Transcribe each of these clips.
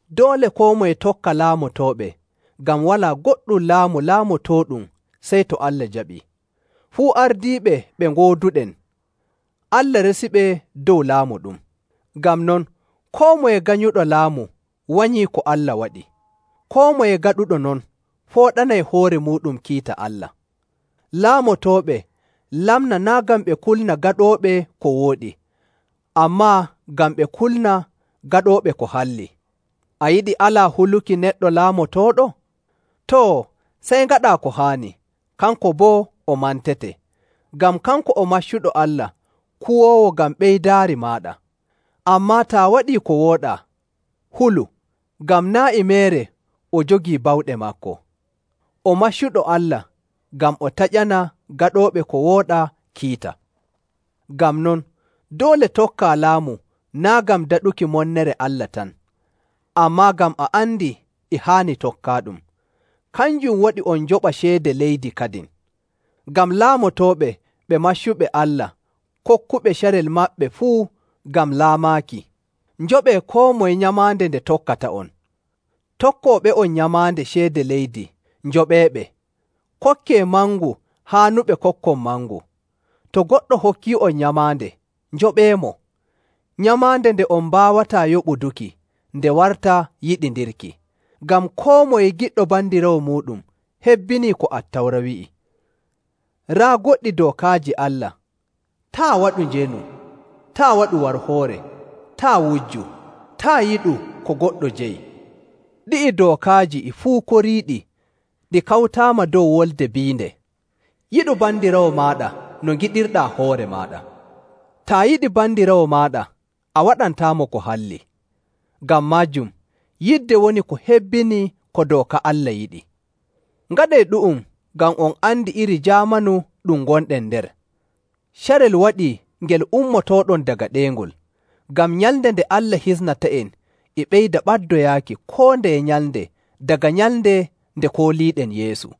Doole koo moye tokka laamotooɓe, ngam walaa goɗɗum laamu laamotooɗum sey to Allah jaɓii. Fuu ardiiɓe ɓe ngooduɗen, Allah resiɓe dow laamu ɗum. Ngam non, koo moye ganyuɗo laamu wanyii ko Allah waɗi. Koo moye gaɗuɗo non fooɗanay hoore muuɗum kiita Allah. Laamotooɓe lamnaa naa' ngam ɓe kulna gaɗooɓe ko wooɗi, ammaa ngam ɓe kulna gaɗooɓe ko halli. A yiɗi alaa huluki neɗɗo laamotooɗo? Too, sey ngaɗaa ko haani, kanko boo o mantete, ngam kanko o maccuɗo Allah kuwoowo ngam ɓeydaari maaɗa. Ammaa taa waɗii ko wooɗaa, hulu, ngam naa' e meere o jogii bawɗe maako. O maccuɗo Allah ngam o taƴana gaɗooɓe ko wooɗaa kiita. Ngam non, doole tokkaa laamu naa' ngam daɗuki monnere Allah tan, ammaa ngam a andi e haani tokkaaɗum. Kanjum waɗi on njoɓa ceede leydi kadin, ngam laamotooɓe ɓe maccuɓe Allah kokkuɓe carel maɓɓe fuu ngam laamaaki. Njoɓee koo moye nyamaande nde tokkata'on, tokkooɓe'on nyamaande ceede leydi, njoɓeeɓe. Kokkee mangu haanuɓe kokkon mangu.. To goɗɗo hokkii'on nyamaande, njoɓeemo. Nyamaande nde on mbaawataa yoɓuduki nde warta yiɗindirki. Ngam koo moye giɗɗo bandiraawo muuɗum hebbinii ko Attawra wi'i. Raa goɗɗi dookaaji Allah, “Taa' waɗu njeenu, taa' waɗu warhoore, taa' wujju, taa' yiɗu ko goɗɗo jeyi.” Ɗi'i dookaaji e fuu koriiɗi ɗi kawtaama dow wolde biinde, “Yiɗu bandiraawo maaɗa no ngiɗirɗaa hoore maaɗa.”. Taa yiɗi bandiraawo maaɗa, a waɗantaamo ko halli. Ngam maajum, yidde woni ko hebbini ko dooka Allah yiɗi. Ngaɗee ɗu'um, ngam on andi iri jaamanu ɗum ngonɗen nder. Carel waɗii ngel ummotooɗon daga ɗeyngol. Ngam nyalnde nde Allah hisnata'en e ɓeyda ɓaddoyaaki koo ndeye nyalnde daga nyalnde nde kooliiɗen Yeesu.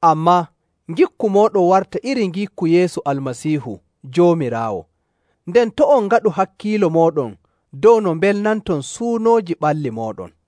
Ammaa, ngikku mooɗon warta iri ngikku Yeesu Almasiihu Joomiraawo, nden to' on ngaɗu hakkiilo mooɗon dow no mbelnanton suunooji ɓalli mooɗon.